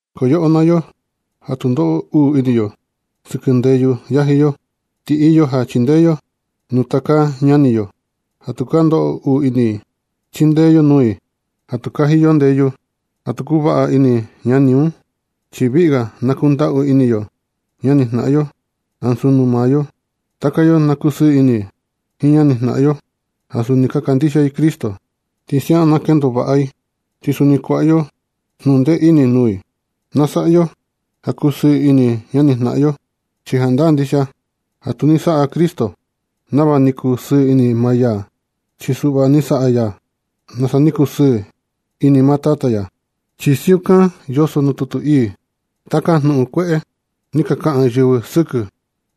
Ko yoꞌo naa yo ja tu ndoꞌo uu ini yo sɨkɨ ndeyu yaji yo, ti iyo ja chindee yo nuu taka ñani yo ja ka ndoꞌo uu ini i. Chindee yo nuu i ja tu kaji yo ndeyu ja tu kuvaꞌa ini ñani un, chi viꞌi ga na kundaꞌu ini yo ñanijnaꞌan yo ansu nuu maa yo. Taka yo na kusɨɨ ini jiin ñanijnaꞌan yo ja suni kandixia i Cristo. Ti siaꞌan na kendo vaꞌa i, ti suni kuaꞌa yo jnundee ini nuu i. Na saꞌa yo ja kusɨɨ ini ñani jnaꞌan yo, chi jandaa ndixia ja tu ni saꞌa Cristo nava ni kusɨɨ ini maa ya, chi suꞌva ni saꞌa ya nasa ni kusɨɨ ini maa Tata ya, chi siukan yoso nuu tutu ii: “Taka jnuꞌun kueꞌe ni ka kaꞌan yɨvɨ sɨkɨ ni,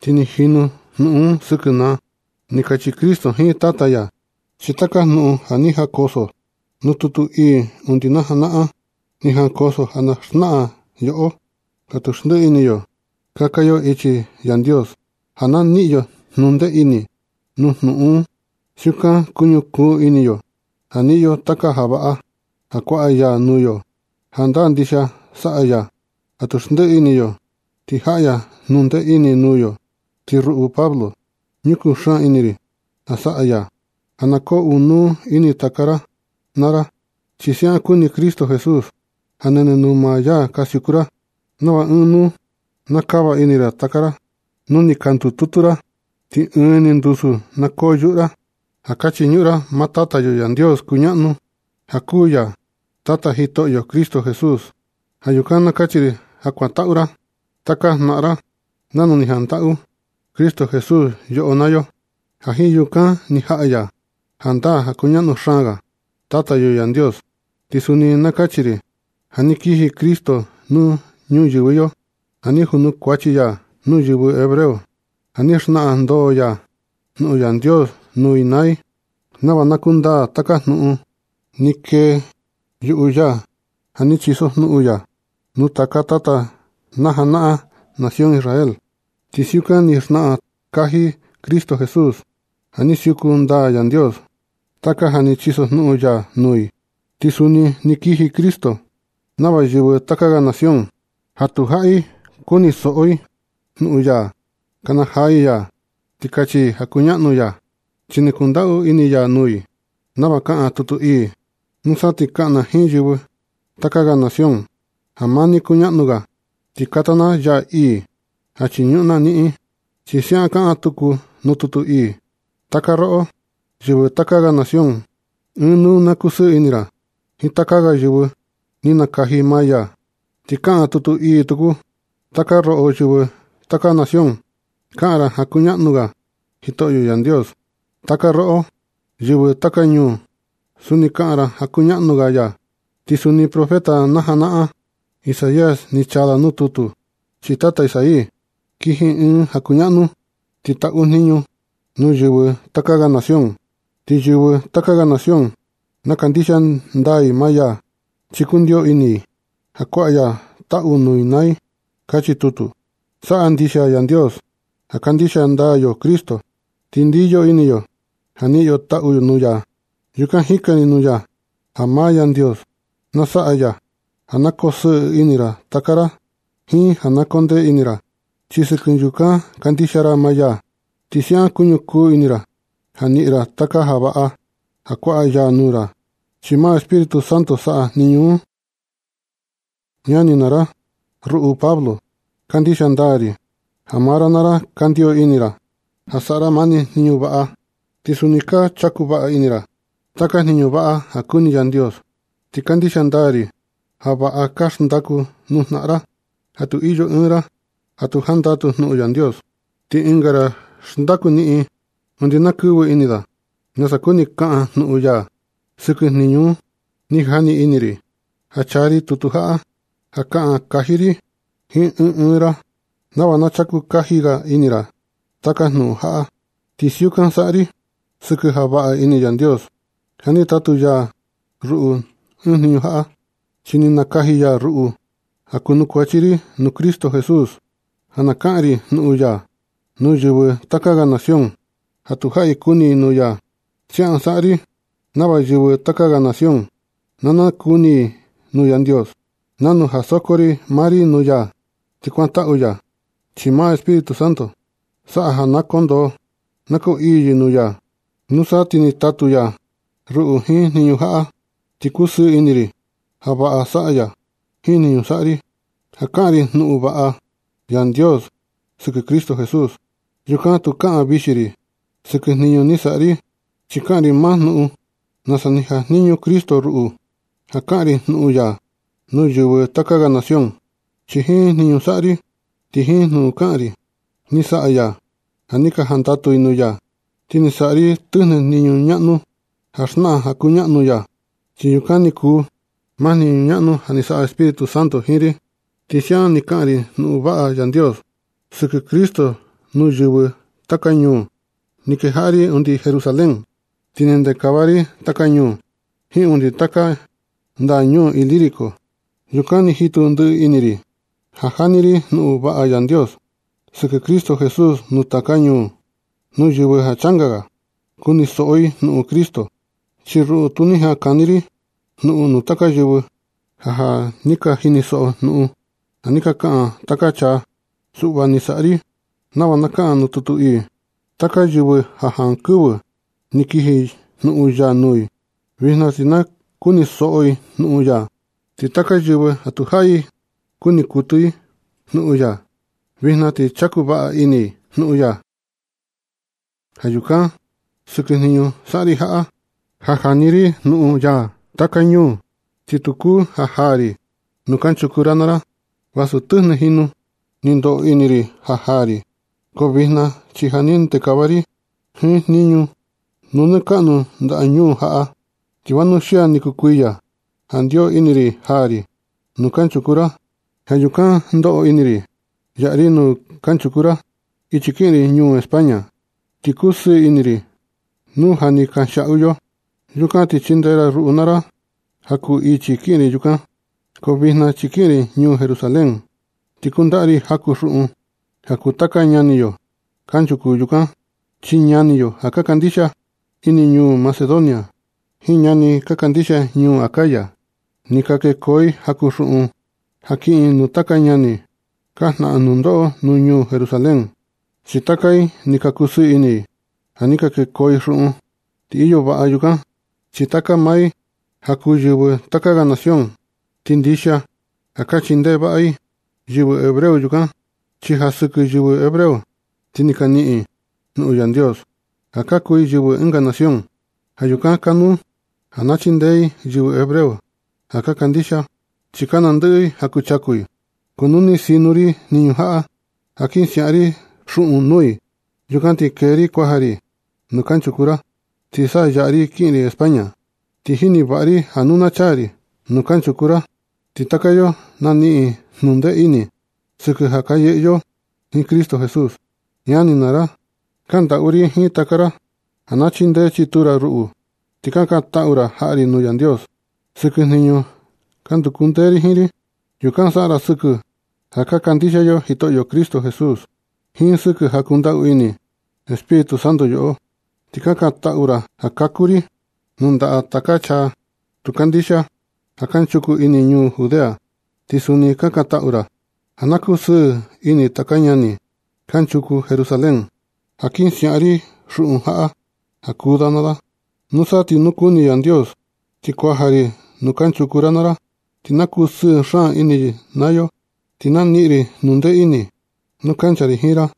ti ni jinu jnuꞌun un sɨkɨ na”, ni kachi Cristo jiin Tata ya. Chi taka jnuꞌun ja ni jankoso nuu tutu ii undi najanaꞌan, ni jankoso ja na xnaꞌan nuu yoꞌo ja tu xndiꞌi ini yo kaka yo nuu ichi Yandios, ja na niꞌin yo jnundee ini nuu jnuꞌun un. Siukan kuñukuu ini yo ja niꞌin yo taka ja vaꞌa ja kuaꞌa ya nuu yo. Jandaa ndixia saꞌa ya ja tu xndiꞌi ini yo, ti jaꞌa ya jnundee ini nuu yo. Ti ruꞌu Pablo, ñukuu xaan ini ri ja saꞌa ya ja na koo ɨɨn nuu ini taka ra naa ra, chi siaꞌan kuni Cristo Jesús ja nɨnɨ nuu maa ya ka siuku ra. Nava ɨɨn nuu na kava ini taka ra naa ra nu ni ka ndututu ra, ti ɨɨn ni ndusu na koo yuꞌu ra ja ka chiñuꞌun ra maa Tata yo Yandios kuñaꞌnu, ja kuu ya Tata Jitoꞌyo Cristo Jesús. Ja yukan na kachi ri ja kuantaꞌu ra taka jnaꞌan ra nanu ni jantaꞌu Cristo Jesús yoꞌo naa yo, ja jiin yukan ni jaꞌa ya jandaa ja kuñaꞌnu xaan ga Tata yo Yandios. Ti suni na kachi ri ja ni kiji Cristo nuu ñuyɨvɨ yo ja ni junukuachi ya nuu yɨvɨ hebreo, ja ni xnaꞌan ndoo ya jnuꞌun Yandios nuu i naa i, nava na kundaa taka jnuꞌun ni keyuꞌu ya ja ni chisojnuꞌun ya nuu taka tata najanaꞌan nación Israel. Ti siukan ni xnaꞌan kaji Cristo Jesús ja ni siuku ndaa Yandios taka ja ni chisojnuꞌun ya nuu i. Ti suni ni kiji Cristo nava yɨvɨ taka ga nación ja tu jaꞌi kunisoꞌo i jnuꞌun ya, kanajaa i ya ti kachi i ja kuñaꞌnu ya, chi ni kundaꞌu ini ya nuu i, nava kaꞌan nuu tutu ii: Nusa ti kaꞌan na jiin yɨvɨ taka ga nación ja maa ni kuñaꞌnu ga, ti kata na yaa ii ja chiñuꞌun na niꞌin. Chi siaꞌan kaꞌan tuku nuu tutu ii: Taka roꞌo, yɨvɨ taka ga nación, ɨɨn nuu na kusɨɨ ini ra jiin taka ga yɨvɨ ni nakaji maa ya. Ti kaꞌan tutu ii tuku: Taka roꞌo yɨvɨ taka nación, kaꞌan ra ja kuñaꞌnu ga Jitoꞌyo Yandios. Ti taka roꞌo, yɨvɨ taka ñuu, suni kaꞌan ra ja kuñaꞌnu ga ya. Ti suni profeta najanaꞌan Isaías ni chaa da nuu tutu: Chii tata Isaí kiji ɨɨn ja kuñaꞌnu. Ti taꞌu jniñu nuu yɨvɨ taka ga nación. Ti yɨvɨ taka nación na kandixia ndaa i maa ya, chi kundio ini i ja kuaꞌa ya taꞌu nuu i naa i. Kachi tutu. Saꞌa ndixia Yandios ja kandixia ndaa yo Cristo, ti ndiyo ini yo ja niꞌin yo taꞌu nuu ya. Yukan jikan ri nuu ya ja maa Yandios na saꞌa ya ja na kosɨɨ ini taka ra, jiin ja na kondee ini ra. Chi sɨkɨ yukan kandixia ra maa ya, ti siaꞌan kuñukuu ini ra ja niꞌin ra taka ja vaꞌa ja kuaꞌa ya nuu ra. Chi maa Espíritu Santo saꞌa jniñu un. Ñani ri naa ra, ruꞌu Pablo, kandixia ndaa ri ja maa ra naa ra ka ndiyo ini ra ja saꞌa ra mani jniñu vaꞌa, ti suni ka chaku vaꞌa ini ra taka jniñu vaꞌa ja kuni Yandios. Ti kandixia ndaa ri ja vaꞌa ka xndaku nuu jnaꞌan ra, ja nu iyo ɨɨn ra ja tu jandatu jnuꞌun Yandios, ti ɨnga ra xndaku niꞌin undi na kɨvɨ ini da nasa kuni kaꞌan jnuꞌun ya sɨkɨ jniñu un. Ni jani ini ri ja chaa ri tutu jaꞌa ja kaꞌan kaji ri jiin ɨɨn ɨɨn ra, nava na chaku kaji ga ini ra taka jnuꞌun jaꞌa. Ti siukan saꞌa ri sɨkɨ ja vaꞌa ini Yandios ja ni tatu ya ruꞌu jiin jniñu jaꞌa. Chi ni nakaji ya ruꞌu ja kunukuachi ri nuu Cristo Jesús, ja na kaꞌan ri jnuꞌun ya nuu yɨvɨ taka ga nación ja tu jaꞌi kuni i jnuꞌun ya. Siaꞌan saꞌa ri nava yɨvɨ taka ga nación na nakuni i nuu Yandios, nanu ja soko ri maa i nuu ya, ti kuantaꞌu ya i, chi maa Espíritu Santo saꞌa ja na koo ndoo na koo ii yɨ nuu ya. Nusa ti ni tatu ya ruꞌu jiin jniñu jaꞌa, ti kusɨɨ ini ri ja vaꞌa saꞌa ya jiin jniñu saꞌa ri, ja kaꞌan ri jnuꞌun vaꞌa Yandios sɨkɨ Cristo Jesús. Yukan tu kaꞌan vixi ri sɨkɨ jniñu ni saꞌa ri, chi kaꞌan ri maa jnuꞌun nasa ni jajniñu Cristo ruꞌu, ja kaꞌan ri jnuꞌun ya nuu yɨvɨ taka ga nación. Chi jiin jniñu saꞌa ri ti jiin jnuꞌun kaꞌan ri, ni saꞌa ya ja ni ka jandatu i nuu ya. Ti ni saꞌa ri tɨjnɨ jniñu ñaꞌnu ja xnaꞌan ja kuñaꞌnu ya, chi yukan ni kuu maa jniñu ñaꞌnu ni saꞌa Espíritu Santo jiin ri. Ti siaꞌan ni kaꞌan ri jnuꞌun vaꞌa Yandios sɨkɨ Cristo nuu yɨvɨ taka ñuu. Ni kejaꞌa ri undi Jerusalén, ti ni ndekava ri taka ñuu jiin undi taka ndaꞌa ñuu Ilírico. Yukan ni jitu ndiꞌi ini ri ni jani ri jnuꞌun vaꞌa Yandios sɨkɨ Cristo Jesús nuu taka ñuu, nuu yɨvɨ ja changa ga kunisoꞌo i jnuꞌun Cristo, chi ruꞌu tu ni jaꞌan kani ri jnuꞌun nuu taka yɨvɨ ja ja ni ka jinisoꞌo jnuꞌun ja ni ka kaꞌan taka ga chaa. Suꞌva ni saꞌa ri nava kaꞌan nuu tutu ii: Taka yɨvɨ ja jankɨvɨ ni kiji jnuꞌun ya nuu i, vijna ti na kunisoꞌo i jnuꞌun ya. Ti taka yɨvɨ ja tu jaꞌi kuni kuɨtɨ i jnuꞌun ya, vijna ti chaku vaꞌa ini i jnuꞌun ya. Ja yukan, sɨkɨ jniñu saꞌa ri jaꞌa, ja jani ri jnuꞌun ya taka ñuu, ti tu kuu ja jaa ri nuu kanchuku ra naa ra. Vasu tɨjnɨ jinu ni ndoꞌo ini ri ja jaa ri. Ko vijna chi ja ni ndekava ri jiin jniñu nuu nɨ kaꞌnu ndaꞌa ñuu jaꞌa, ti vanuxia ni kuu kuiya ja ndio ini ri jaa ri nuu kanchuku ra. Ja yukan ndoꞌo ini ri yaꞌa ri nuu kanchuku ra ichi kiꞌin ri nuu España. Ti kusɨɨ ini ri nu ja ni ka kanxiaꞌu yo. Yukan ti chindee ra ruꞌu naa ra ja kuu ichi kiꞌin ri yukan. Ko vijna chi kiꞌin ri ñuu Jerusalén, ti kundaꞌa ri jaku xuꞌun ja kuu taka ñani yo kanchuku yukan. Chi ñani yo ja ka kandixia ini ñuu Macedonia jiin ñani ka kandixia ñuu Acaya, ni ka kueko i jaku xuꞌun ja kiꞌin nuu taka ñani ka jnaꞌan nundoꞌo ñuu Jerusalén. Chi taka i ni kusɨɨ ini ja ni ka kueco i xuꞌun. Ti iyo vaꞌa yukan, chi taka maa i ja kuu yɨvɨ taka ga nación, ti ndixia ja ka chindee vaꞌa i yɨvɨ hebreo yukan. Chi ja sɨkɨ yɨvɨ hebreo ti ni ka niꞌin i jnuꞌun Yandios ja ka kuu i yɨvɨ ɨnga nación. Ja yukan kanuu na chindee i yɨvɨ hebreo ja ka kandixia, chi ka nandɨꞌɨ i ja kuchaku i. Ko nu ni sino ri jniñu jaꞌa ja kin siaꞌa ri xuꞌun nuu i, yukan ti kee ri kuaja ri nuu kanchuku ra, ti sa yaꞌa ri kiꞌin ri España. Ti jini vaꞌa ri ja nu na chaa ri nuu kanchuku ra, ti taka yo na niꞌin jnundee ini sɨkɨ ja ka yɨꞌɨ yo jiin Cristo Jesús. Ñani naa ra, kaꞌan ndaꞌu ri jiin taka ra ja na chindee chituu ra ruꞌu, ti kakantaꞌu ra jaꞌa ri nuu Yandios sɨkɨ jniñu ja nduku ndee ri jiin. Yukan saꞌa ra sɨkɨ ja ka kandixia yo Jitoꞌyo Cristo Jesús, jiin sɨkɨ ja kundaꞌu ini Espíritu Santo yoꞌo. Ti kakantaꞌu ra ja na kaku ri nuu ndaꞌa taka chaa tu ka kandixia ja kanchuku ini ñuu Judea. Ti suni kakantaꞌu ra ja na kusɨɨ ini taka ñani kanchuku Jerusalén ja kin siaꞌa ri xuꞌun jaꞌa ja kuu da naa da. Nusa ti nu kuni Yandios ti kuaja ri nuu kanchuku ra naa ra, ti na kusɨɨ xaan ini yo naa yo, ti na niꞌin ri jnundee ini nu kancha ri jiin ra.